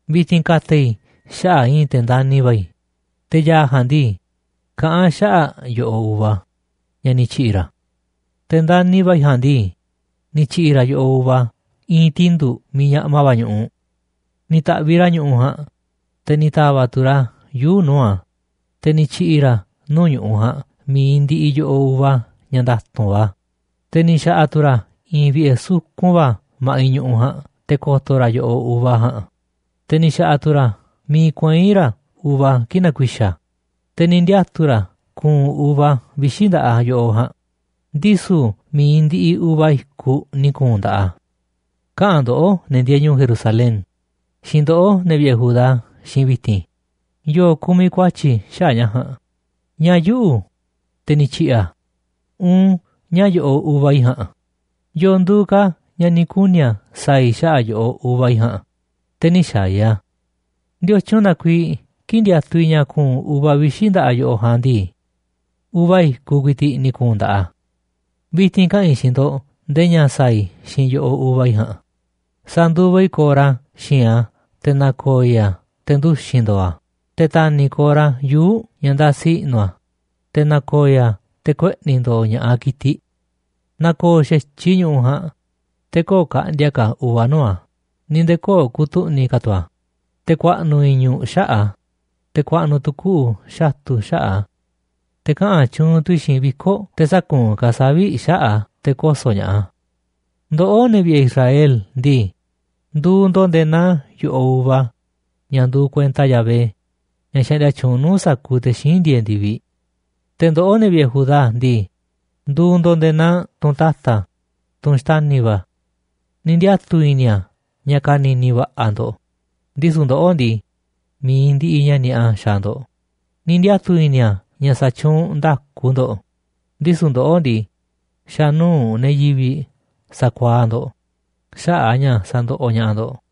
Vi̱ti̱n ka̱ta̱ i̱ xaꞌa̱ꞌ i̱i̱n te̱ ndani̱ va̱ i̱, te̱ ya̱a̱ ja̱a̱nꞌ ndii, kaꞌán a̱ xaꞌa̱ꞌ yo̱ꞌoꞌ uva ña̱ ni̱ tyi̱ꞌi̱ ra̱. Te̱ ndani̱ va̱ i̱ ja̱a̱nꞌ ndii, ni̱ tyi̱ꞌi̱ ra̱ yo̱ꞌoꞌ uva i̱i̱n tindu̱ꞌ miiꞌ ñaꞌma va̱ ñu̱ꞌuꞌ. Ni̱ ta̱ꞌviꞌ ra̱ ñu̱ꞌuꞌ ja̱a̱nꞌ, te̱ ni̱ ta̱va̱ꞌ tu̱ ra̱ yuu̱ꞌ nuu̱ꞌ a̱, te̱ ni̱ tyi̱ꞌi̱ ra̱ nuu̱ꞌ ñu̱ꞌuꞌ ja̱a̱nꞌ mi̱iꞌ ndiꞌiꞌ yo̱ꞌoꞌ uva ña̱ nda̱tu̱nꞌ va̱. Te̱ ni̱ xa̱ꞌa̱ tu̱ ra̱ i̱i̱n vi̱ꞌe̱ sukun va̱ ma̱ꞌiꞌ ñu̱ꞌuꞌ ja̱a̱nꞌ te̱ ko̱to̱ ra̱ yo̱ꞌoꞌ uva ja̱a̱nꞌ, te̱ ni̱ xa̱ꞌa̱ tu̱ ra̱ miiꞌ kuei̱n ra̱ uva kii̱ꞌ na̱ku̱i̱xa̱ a̱. Te̱ ni̱ ndiatu̱ ra̱ ña̱ ku̱u̱n uva vixi̱ nda̱ꞌaꞌ yo̱ꞌoꞌ ja̱a̱nꞌ, ndisu̱ mi̱iꞌ ndiꞌiꞌ uva i̱kuꞌ ni̱ ku̱u̱n nda̱ꞌaꞌ a̱. Kaꞌa̱n ndoꞌó, ne̱ ndieeꞌ ñu̱u̱ Jerusalén, xiinꞌ ndoꞌó, ne̱ vi̱ꞌe̱ Judá xiinꞌ i̱ vi̱ti̱n. ¿Yo̱o̱ kumiꞌ ku̱a̱tyi̱ xaꞌa̱ꞌ ña̱ ja̱a̱nꞌ? ¿Ñáá yuꞌu̱, te̱ ni̱ tyi̱ꞌi̱ a̱, uun ñáá yo̱ꞌoꞌ uva i̱ ja̱a̱nꞌ? ¿Yo̱o̱ nduuꞌ ka̱ ña̱ ni̱ kuni̱ a̱ sa̱a̱ i̱ xaꞌa̱ꞌ yo̱ꞌoꞌ uva i̱ ja̱a̱nꞌ, te̱ nï̱ xaaꞌ i̱ a̱? ¿Ndiotyun na kuiiꞌ kii̱ꞌ ndiatuꞌ i̱ ña̱ ku̱u̱n uva vixi̱ nda̱ꞌaꞌ yo̱ꞌoꞌ ja̱a̱nꞌ ndii, uva i̱kuꞌ ku̱i̱ti̱ꞌ ni̱ ku̱u̱n nda̱ꞌaꞌ a̱? Vi̱ti̱n kaꞌa̱n i̱ xiinꞌ ndo̱ꞌ ndee ña̱ sa̱a̱ i̱ xiinꞌ yo̱ꞌoꞌ uva i̱ ja̱a̱nꞌ: Sa̱nduva i̱ corra xi̱i̱nꞌ a̱, te̱ na̱ko̱o̱ i̱ a̱ te̱ nduxi̱n ndo̱o̱ a̱. Te̱ ta̱ni̱ i̱ corra yuu̱ꞌ ña̱ ndasi i̱ꞌnu̱ a̱, te̱ na̱ko̱o̱ i̱ a̱ te̱ kueꞌni̱ ndo̱o̱ ña̱ꞌaꞌ ki̱tiꞌ. Na̱ko̱o̱ xa̱tyiꞌ i̱ ñu̱ꞌuꞌ ja̱a̱nꞌ, te̱ köo̱ꞌ ka̱ꞌndi̱a̱ ka̱ uva nuu̱ꞌ a̱ ni̱ nde̱e̱ köo̱ꞌ ku̱tu̱ꞌni̱ ka̱ tu̱ a̱, te̱ ku̱a̱ꞌnu̱ i̱ñu̱ꞌ xaꞌa̱ꞌ a̱, te̱ ku̱a̱ꞌnu̱ tu̱ kuꞌu̱ xatu̱ xaꞌa̱ꞌ a̱. Te̱ kaꞌa̱n tyuunꞌ tu̱ i̱ xiinꞌ viko̱ꞌ te̱ sä̱kuunꞌ ka̱ a̱ savi̱ꞌ xaꞌa̱ꞌ a̱ te̱ koso̱ ña̱ꞌaꞌ a̱. Ndoꞌó, ne̱ vi̱ꞌe̱ Israel ndii, nduuꞌ ndo̱ꞌ nde̱e̱ naa yo̱ꞌoꞌ uva ña̱ nduuꞌ kuenta Yahvé, ña̱ xaꞌndia tyuunꞌ nuu̱ꞌ sa̱kuuꞌ te̱ xíinꞌ ndieeꞌ ndi̱viꞌ. Te̱ ndoꞌó, ne̱ vi̱ꞌe̱ Judá ndii, nduuꞌ ndo̱ꞌ nde̱e̱ naa tunꞌ ta̱ta̱, tunꞌ xtani̱ va̱ a̱. Ni̱ ndiatu̱ i̱ni̱ a̱ ña̱ ka̱ni̱ni̱ va̱ꞌa̱ ndo̱ꞌ, ndisu̱ ndoꞌó ndii, mi̱iꞌ ndiꞌiꞌ ña̱ ni̱a̱ꞌa xaaꞌ ndo̱ꞌ. Ni̱ ndiatu̱ i̱ni̱ a̱ ña̱ sa̱tyuunꞌ nda̱ku ndo̱ꞌ, ndisu̱ ndoꞌó ndii, xa̱ nuu̱ꞌ ne̱ yivi̱ꞌ sakuaaꞌ ndo̱ꞌ xaꞌa̱ꞌ a̱ ña̱ sandoꞌoꞌ ña̱ꞌaꞌ ndo̱ꞌ.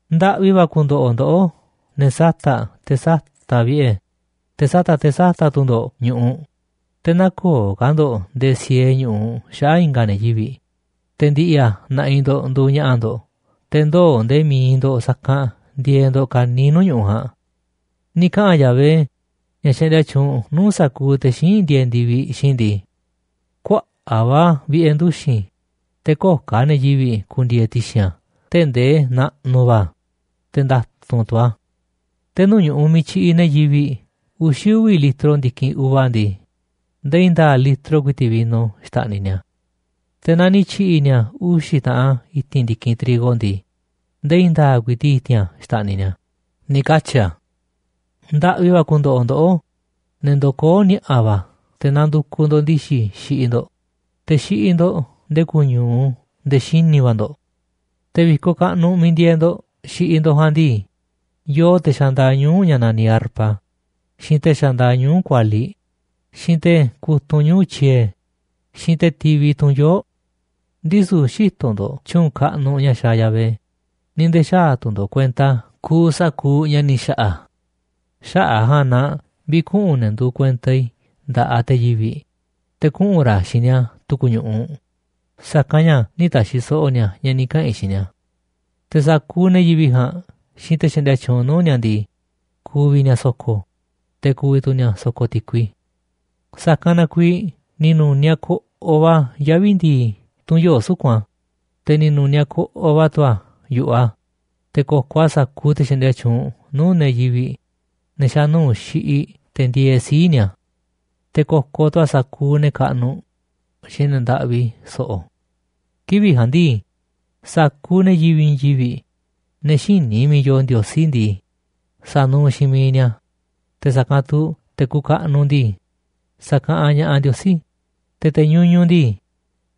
Ndaꞌvi va̱ ku̱ndo̱ꞌo̱ ndoꞌó ne̱ sata̱ꞌ te̱ sata̱ꞌ vi̱ꞌe̱, te̱ sata̱ꞌ te̱ sata̱ꞌ tu̱ ndo̱ꞌ ñu̱ꞌuꞌ, te̱ nä̱ko̱o̱ ka̱ ndo̱ꞌ nde̱e̱ siee ñu̱ꞌuꞌ xaꞌa̱ꞌ i̱nga̱ ne̱ yivi̱ꞌ, te̱ ndi̱ꞌi̱ a̱ na̱ꞌi̱ ndo̱ꞌ nduuꞌ ña̱ꞌa̱ ndo̱ꞌ, te̱ ndoo̱ nde̱e̱ mi̱iꞌ ndo̱ꞌ sa̱kanꞌ ndieeꞌ ndo̱ꞌ ka̱niiꞌ nuu̱ꞌ ñu̱ꞌuꞌ ja̱a̱nꞌ. Ni̱ kaꞌa̱n Yahvé, ña̱ xaꞌndia tyuunꞌ nuu̱ꞌ sa̱kuuꞌ te̱ xíinꞌ ndieeꞌ ndi̱viꞌ, xiinꞌ i̱ ndii: “Kuaꞌa̱ꞌ va̱ vi̱ꞌe̱ nduxi̱n, te̱ köo̱ꞌ ka̱ ne̱ yivi̱ꞌ ku̱ndi̱e̱e̱ ti̱xi̱n a̱ tee̱ꞌ ndee naꞌnuꞌ va̱ a̱, te̱ nda̱tu̱nꞌ tu̱ a̱. Te̱ nuu̱ꞌ ñu̱ꞌuꞌ miiꞌ tyiꞌiꞌ ne̱ yivi̱ꞌ uxi̱ uvi̱ litro ndi̱kinꞌ uva ndii, ndee i̱i̱n nda̱a̱ꞌ litro ku̱i̱ti̱ꞌ vino xta̱ꞌniꞌ ni̱a̱, te̱ naaꞌ ni̱ tyi̱ꞌi̱ ni̱a̱ uxi̱ taꞌan i̱ti̱n ndi̱kinꞌ trigo ndii, ndee i̱i̱n nda̱a̱ꞌ ku̱i̱ti̱ꞌ i̱ti̱n a̱ xta̱ꞌniꞌ ni̱a̱”, ni̱ katyi̱ a̱. Ndaꞌvi va̱ ku̱ndo̱ꞌo̱ ndoꞌó, ne̱ ndokoó ni̱a̱ꞌa̱ va̱ te̱ nandukuꞌ ndo̱ꞌ ndi̱xi̱ xiꞌiꞌ ndo̱ꞌ, te̱ xiꞌiꞌ ndo̱ꞌ nde̱e̱ kuñu̱u nde̱e̱ xini̱ va̱ ndo̱ꞌ. Te̱ vi̱koꞌ kaꞌnuꞌ miiꞌ ndieeꞌ ndo̱ꞌ xiꞌiꞌ ndo̱ꞌ ja̱a̱nꞌ ndii, yoo te̱ xandaaꞌ ñuu̱ꞌ ña̱ naniꞌ arpa, xiinꞌ te̱ xandaaꞌ ñuu̱ꞌ kualiꞌ, xiinꞌ te̱ kutunꞌ ñuu̱ꞌ tyiee̱, xiinꞌ te̱ tivi tunꞌ yoo̱ꞌ. Ndisu̱ xïtoꞌ ndo̱ꞌ tyu̱u̱n kaꞌnuꞌ ña̱ xaaꞌ Yahvé ni̱ nde̱e̱ xäaꞌ tu̱ ndo̱ꞌ kuenta kuuꞌ sa̱kuuꞌ ña̱ ni̱ xa̱ꞌa̱ a̱. Xaꞌa̱ꞌ a̱ ja̱a̱nꞌ na vi̱kuꞌu̱n ne̱ nduuꞌ kuenta i̱ nda̱ꞌaꞌ te̱ yivi̱ꞌ, te̱ kuꞌu̱n ra̱ xiinꞌ ni̱a̱ tu̱ku̱ ñu̱ꞌuꞌ, sa̱kanꞌ ña̱ nï̱ ta̱xi̱ so̱ꞌo̱ ni̱a̱ ña̱ ni̱ kaꞌa̱n i̱ xiinꞌ ni̱a̱. Te̱ sa̱kuuꞌ ne̱ yivi̱ꞌ ja̱a̱nꞌ xiinꞌ te̱ xaꞌndia tyuunꞌ nuu̱ꞌ ni̱a̱ ndii, ku̱vi̱ ni̱a̱ so̱ko̱, te̱ ku̱vi̱ tu̱ ni̱a̱ so̱ko̱ ti̱kui. Sa̱kanꞌ na kuiiꞌ ni̱ nu̱niaꞌ koꞌoꞌ va̱ yavi̱ ndi̱i̱ tunꞌ yoo̱ꞌ suku̱nꞌ a̱, te̱ ni̱ nu̱niaꞌ koꞌoꞌ va̱ tu̱ a̱ yu̱ꞌuꞌ a̱, te̱ ko̱koꞌ a̱ sa̱kuuꞌ te̱ xaꞌndia tyuunꞌ nuu̱ꞌ ne̱ yivi̱ꞌ, ne̱ xa̱ nuu̱ꞌ xiꞌiꞌ, te̱ ndieeꞌ sii̱ꞌ ni̱a̱. Te̱ ko̱koꞌ tu̱ a̱ sa̱kuuꞌ ne̱ kaꞌnuꞌ xiinꞌ ne̱ ndaꞌvi so̱ꞌo̱. Kivi̱ꞌ ja̱a̱nꞌ ndii, sa̱kuuꞌ ne̱ yivi̱ꞌ i̱i̱n yivi̱ꞌ, ne̱ xïní miiꞌ yooꞌ Ndiosí ndii, sa̱nuuꞌ xiinꞌ miiꞌ ni̱a̱, te̱ sa̱kanꞌ tu̱ sa̱kuuꞌ te̱ kuuꞌ kaꞌnuꞌ ndii, sa̱kaꞌanꞌ ña̱ꞌaꞌ Ndiosí, te̱ te̱ ñuñuꞌ ndii,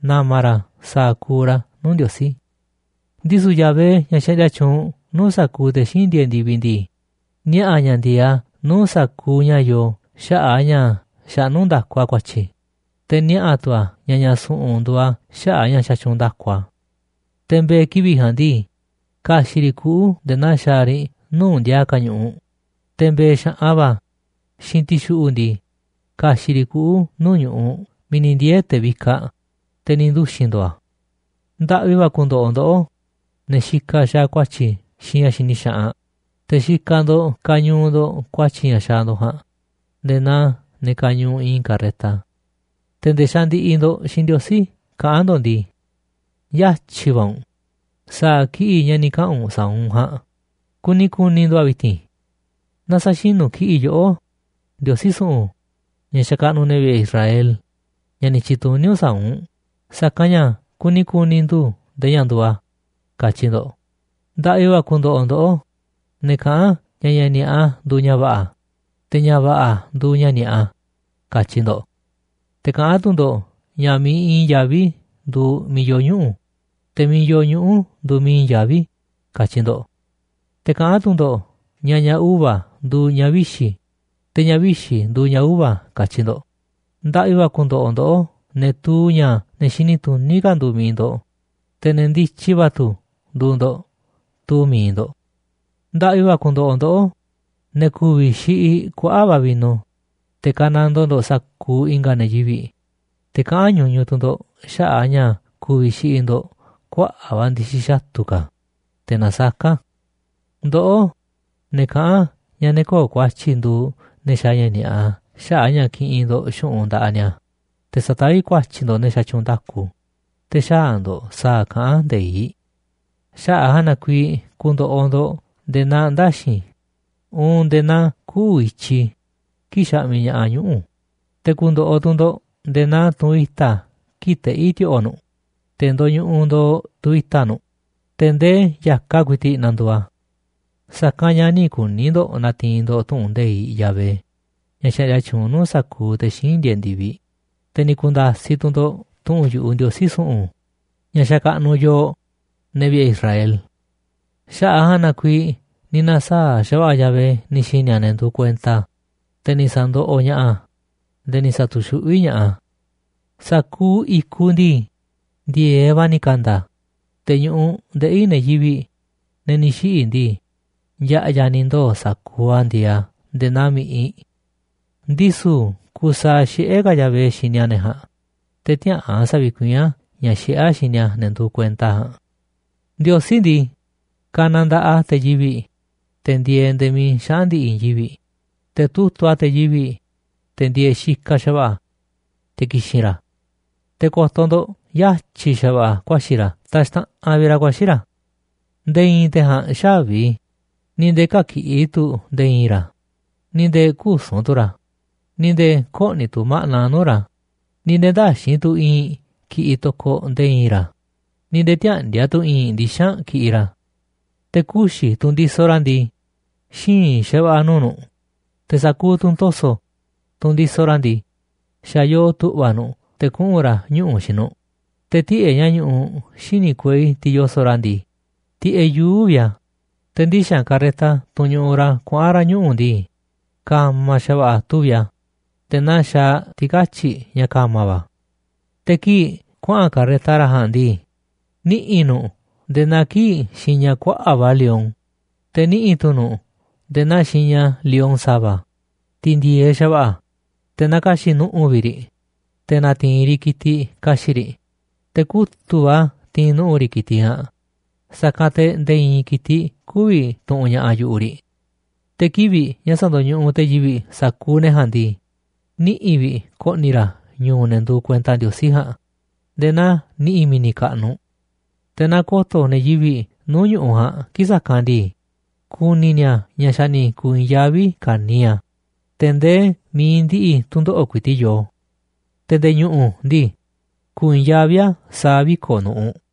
na̱ma̱ ra̱ sa̱a̱ kuuꞌ ra̱ nuu̱ꞌ Ndiosí. Ndisu̱ Yahvé, ña̱ xaꞌndia tyuunꞌ nuu̱ꞌ sa̱kuuꞌ te̱ xíinꞌ ndieeꞌ ndi̱viꞌ ndii, niaꞌa̱ a̱ ña̱ ndi̱e̱eꞌ a̱ nuu̱ꞌ sa̱kuuꞌ ña̱ yoo xaꞌa̱ꞌ a̱ ña̱ xaꞌnú nda̱ku a̱ ku̱a̱tyi̱, te̱ niaꞌa̱ tu̱ a̱ ña̱ ña̱ su̱ꞌu̱n nduuꞌ a̱ xaꞌa̱ꞌ a̱ ña̱ xatyuunꞌ nda̱ku a̱. Te̱ mbe̱e̱ kivi̱ꞌ ja̱a̱nꞌ ndii, ka̱xi̱ꞌ riꞌ kuꞌu̱ nde̱e̱ naa xaaꞌ riꞌ nuu̱ꞌ ndiaa ka̱ ñu̱ꞌuꞌ, te̱ mbe̱e̱ xa̱ꞌan va̱ xiinꞌ ti̱xuꞌu̱ꞌ ndii, ka̱xi̱ꞌ riꞌ kuꞌu̱ nuu̱ꞌ ñu̱ꞌuꞌ miiꞌ ni̱ ndiee̱ te̱ vikaꞌ, te̱ ni̱ nduxi̱n ndo̱o̱ a̱. Ndaꞌvi va̱ ku̱ndo̱ꞌo̱ ndoꞌó, ne̱ xikaꞌ xaaꞌ ku̱a̱tyi̱ xiinꞌ ña̱ xini xaꞌanꞌ, te̱ xikaꞌ ndo̱ꞌ kañuuꞌ ndo̱ꞌ ku̱a̱tyi̱ ña̱ xaaꞌ ndo̱ꞌ ja̱a̱nꞌ nde̱e̱ naa ne̱ kañuuꞌ i̱i̱n karreta. Te̱ nde̱e̱ xandiꞌiꞌ ndo̱ꞌ xiinꞌ Ndiosí kaꞌán ndo̱ꞌ ndii: “Yatyi̱ va̱ u̱nꞌ sa̱a̱ kiꞌi̱ꞌ ña̱ ni̱ kaꞌa̱n u̱nꞌ sa̱a̱ u̱nꞌ ja̱a̱nꞌ kuni ku̱ni̱ ndu̱ꞌ a̱ vi̱ti̱n. Na sa̱xinu̱ kiꞌi̱ꞌ yoꞌó, Ndiosí su̱ꞌu̱n, ña̱ xakaꞌnuꞌ ne̱ vi̱ꞌe̱ Israel, ña̱ ni̱ tyi̱tuní u̱nꞌ sa̱a̱ u̱nꞌ, sa̱kanꞌ ña̱ kuni ku̱ni̱ ndu̱ꞌ ndee ña̱ nduuꞌ a̱”, katyi ndo̱ꞌ. Ndaꞌvi va̱ ku̱ndo̱ꞌo̱ ndoꞌó, ne̱ kaꞌán ña̱ ña̱ ni̱a̱ꞌa nduuꞌ ña̱ va̱ꞌa̱, te̱ ña̱ va̱ꞌa̱ nduuꞌ ña̱ ni̱a̱ꞌa, katyi ndo̱ꞌ. Te̱ kaꞌán tu̱ ndo̱ꞌ ña̱ miiꞌ i̱i̱n yaví nduuꞌ miiꞌ yoo ñuꞌu̱, te̱ miiꞌ yoo ñuꞌu̱ nduuꞌ miiꞌ i̱i̱n yaví, katyi ndo̱ꞌ. Te̱ kaꞌán tu̱ ndo̱ꞌ ña̱ ña̱ uva̱ nduuꞌ ña̱ vixi̱, te̱ ña̱ vixi̱ nduuꞌ ña̱ uva̱, katyi ndo̱ꞌ. Ndaꞌvi va̱ ku̱ndo̱ꞌo̱ ndoꞌó, ne̱ tuu ña̱ ne̱ xini tuní ka̱ nduuꞌ mi̱iꞌ ndo̱ꞌ, te̱ ne̱ ndityi va̱ tu̱ nduuꞌ ndo̱ꞌ tuu mi̱iꞌ ndo̱ꞌ. Ndaꞌvi va̱ ku̱ndo̱ꞌo̱ ndoꞌó, ne̱ ku̱vi̱ xiꞌiꞌ kuaꞌa̱ꞌ va̱ vino, te̱ kanandoo ndo̱ꞌ sa̱kuuꞌ i̱nga̱ ne̱ yivi̱ꞌ, te̱ kaꞌán ñuñuꞌ tu̱ ndo̱ꞌ xaꞌa̱ꞌ a̱ ña̱ ku̱vi̱ xiꞌiꞌ ndo̱ꞌ kuaꞌa̱ꞌ va̱ ndi̱xi̱ xatu̱ ka̱, teꞌ nasaká. Ndoꞌó, ne̱ kaꞌán ña̱ ne̱ köo̱ꞌ ku̱a̱tyi̱ nduuꞌ ne̱ xaaꞌ ña̱ ni̱a̱ꞌa xaꞌa̱ꞌ a̱ ña̱ kiꞌinꞌ ndo̱ꞌ xu̱ꞌunꞌ nda̱ꞌaꞌ ni̱a̱, te̱ sataví ku̱a̱tyi̱ ndo̱ꞌ ne̱ xatyuunꞌ nda̱kuꞌ, te̱ xäaꞌ ndo̱ꞌ sa̱a̱ kaꞌán nde̱iꞌ. Xaꞌa̱ꞌ a̱ ja̱a̱nꞌ na kuiiꞌ ku̱ndo̱ꞌo̱ ndo̱ꞌ nde̱e̱ naa ndaxi̱n uun nde̱e̱ naa kuꞌu̱ i̱tyi kii̱ꞌ xaꞌmiꞌ ña̱ꞌaꞌ ñuꞌu̱, te̱ ku̱ndo̱ꞌo̱ tu̱ ndo̱ꞌ nde̱e̱ naa tunꞌ i̱ta̱ kii̱ꞌ teꞌí ti̱o̱ꞌo̱ nu̱ꞌ, te̱ ndoñuꞌuꞌ ndooꞌ tu̱ i̱ta̱ nu̱ꞌ, te̱ ndee ya̱kaꞌ ku̱i̱ti̱ꞌ na̱ndu̱u̱ a̱. Sa̱kanꞌ ña̱ nï̱ kuni̱ ndo̱ꞌ na̱ti̱i̱n ndo̱ꞌ tu̱ꞌu̱n nde̱iꞌ Yahvé, ña̱ xaꞌndia tyuunꞌ nuu̱ꞌ sa̱kuuꞌ te̱ xíinꞌ ndieeꞌ ndi̱viꞌ, te̱ ni̱ ku̱nda̱siꞌ tu̱ ndo̱ꞌ tu̱ꞌu̱n yu̱ꞌuꞌ Ndiosí su̱ꞌu̱n, ña̱ xakaꞌnuꞌ yooꞌ, ne̱ vi̱ꞌe̱ Israel. Xaꞌa̱ꞌ a̱ ja̱a̱nꞌ na kuiiꞌ ni̱ na̱saa̱ꞌ xa̱va̱ꞌa̱ Yahvé ni̱ xi̱ni̱ a̱ ne̱ nduuꞌ kuenta a̱, te̱ ni̱ sa̱ndoꞌoꞌ ña̱ꞌaꞌ a̱, nde̱e̱ ni̱ sa̱tu̱xuꞌví ña̱ꞌaꞌ a̱. Sa̱kuuꞌ i̱kuꞌ ndii, ndi̱e̱eꞌ va̱ ni̱ ka̱nda̱ a̱, te̱ ñu̱ꞌuꞌ ndeꞌi̱ ne̱ yivi̱ꞌ, ne̱ ni̱ xiꞌi̱ ndii, ya̱ꞌya̱ ni̱ ndoo̱ sa̱kuuꞌ a̱ ndieeꞌ a̱ nde̱e̱ naa mi̱ꞌiꞌ. Ndisu̱ kusaaꞌ xiꞌé ka̱ Yahvé xini a̱ ne̱ ja̱a̱nꞌ, te̱ tiäꞌa̱an sa̱vi̱kuiín a̱ ña̱ xiꞌé a̱ xini a̱ ne̱ nduuꞌ kuenta a̱ ja̱a̱nꞌ. Ndiosí ndii, ka̱na̱ nda̱ꞌaꞌ a̱ te̱ yivi̱ꞌ, te̱ ndieeꞌ nde̱e̱ miiꞌ xaꞌa̱n ndi̱ꞌi̱ i̱i̱n yivi̱ꞌ, te̱ tutu̱ꞌ a̱ te̱ yivi̱ꞌ, te̱ ndieeꞌ xikaꞌ xa̱va̱ꞌa̱, te̱ ki̱xi̱n ra̱. Te̱ ko̱to̱ ndo̱ꞌ yatyi̱ xa̱va̱ꞌa̱ ku̱a̱xi̱ ra̱ taxtaꞌanꞌ vi̱ꞌ ra̱ ku̱a̱xi̱ ra̱. Nde̱e̱ i̱i̱n te̱ ja̱a̱nꞌ xä̱vi, ni̱ nde̱e̱ kä̱kiꞌi̱ tu̱ nde̱e̱ i̱i̱n ra̱, ni̱ nde̱e̱ küsu̱n tu̱ ra̱, ni̱ nde̱e̱ kö̱ꞌni̱ tu̱ ma̱ꞌna nuu̱ꞌ ra̱, ni̱ nde̱e̱ ndäxi̱nꞌ tu̱ i̱i̱nꞌ kiꞌiꞌ to̱koꞌ nde̱e̱ i̱i̱n ra̱, ni̱ nde̱e̱ tiäꞌndi̱a̱ tu̱ i̱i̱n ndixa̱nꞌ kiꞌiꞌ ra̱. Te̱ kuxi̱, tunꞌ ndisoꞌ ra̱ ndii, xíinꞌ xa̱va̱ꞌa̱ nuu̱ꞌ nu̱ꞌ, te̱ sa̱kuuꞌ tunꞌ to̱so̱, tunꞌ ndisoꞌ ra̱ ndii, xa̱ yoo tu̱ꞌva̱ nu̱ꞌ te̱ kuꞌu̱n ra̱ ñuꞌu̱ xiinꞌ nu̱ꞌ. Te̱ tiꞌe̱ꞌ ña̱ ñuꞌuꞌ xíniꞌ kuei tiꞌ yoso̱ꞌ ra̱ ndii, tiꞌeꞌ yuu̱ꞌ vi̱ꞌ a̱, te̱ ndixa̱nꞌ karreta, tunꞌ ñuꞌuꞌ ra̱ kuaꞌa̱n ni̱a̱ ñuꞌu̱ ndii, ka̱ma̱ xa̱va̱ꞌa̱ tuvi̱ꞌ a̱ nde̱e̱ naa xaaꞌ ti̱katyi̱ꞌ ña̱ ka̱ma̱ va̱ a̱. Te̱ kii̱ꞌ kuaꞌa̱n karreta ra̱ ja̱a̱nꞌ ndii, niꞌi̱ nu̱ꞌ nde̱e̱ naa kii̱ꞌ xiña kuaꞌa̱ꞌ va̱ lion, te̱ niꞌi̱ tu̱ nu̱ꞌ nde̱e̱ naa xiña lion sa̱va̱, tiꞌ ndi̱e̱eꞌ xa̱va̱ꞌa̱, te̱ nakaxi̱ꞌ nu̱ꞌu̱ vi̱ꞌ riꞌ, te̱ na̱ti̱i̱n riꞌ ki̱tiꞌ ka̱xi̱ꞌ riꞌ, te̱ kutu̱ꞌ va̱ ti̱i̱n nu̱ꞌu̱ riꞌ ki̱tiꞌ ja̱a̱nꞌ, sa̱kanꞌ te̱ nde̱e̱ i̱i̱n ki̱tiꞌ kü̱vi̱ tu̱ꞌu̱n ña̱ꞌaꞌ yu̱ꞌuꞌ riꞌ. Te̱ kivi̱ꞌ ña̱ sa̱ndo̱ñuꞌuꞌ te̱ yivi̱ꞌ sa̱kuuꞌ ne̱ ja̱a̱nꞌ ndii, niꞌi̱ vi̱ꞌ ko̱ꞌni̱ ra̱ ñu̱u̱ ne̱ nduuꞌ kuenta Ndiosí ja̱a̱nꞌ nde̱e̱ naa niꞌi̱ mi̱ni̱ kaꞌnuꞌ. Te̱ naaꞌ ko̱to̱ ne̱ yivi̱ꞌ nuu̱ꞌ ñu̱ꞌuꞌ ja̱a̱nꞌ kii̱ꞌ sa̱kanꞌ ndii, ku̱ni̱ ni̱a̱ ña̱ xa̱ ni̱ ku̱u̱ i̱i̱n yaví ka̱niiꞌ a̱, te̱ ndee mi̱iꞌ ndiꞌiꞌ tu̱ndoꞌo̱ꞌ ku̱i̱ti̱ꞌ yoo, te̱ nde̱e̱ ñu̱ꞌu̱ ndii, ku̱u̱ i̱i̱n yaví a̱ sa̱a̱ viko̱ꞌ nu̱ꞌuꞌ.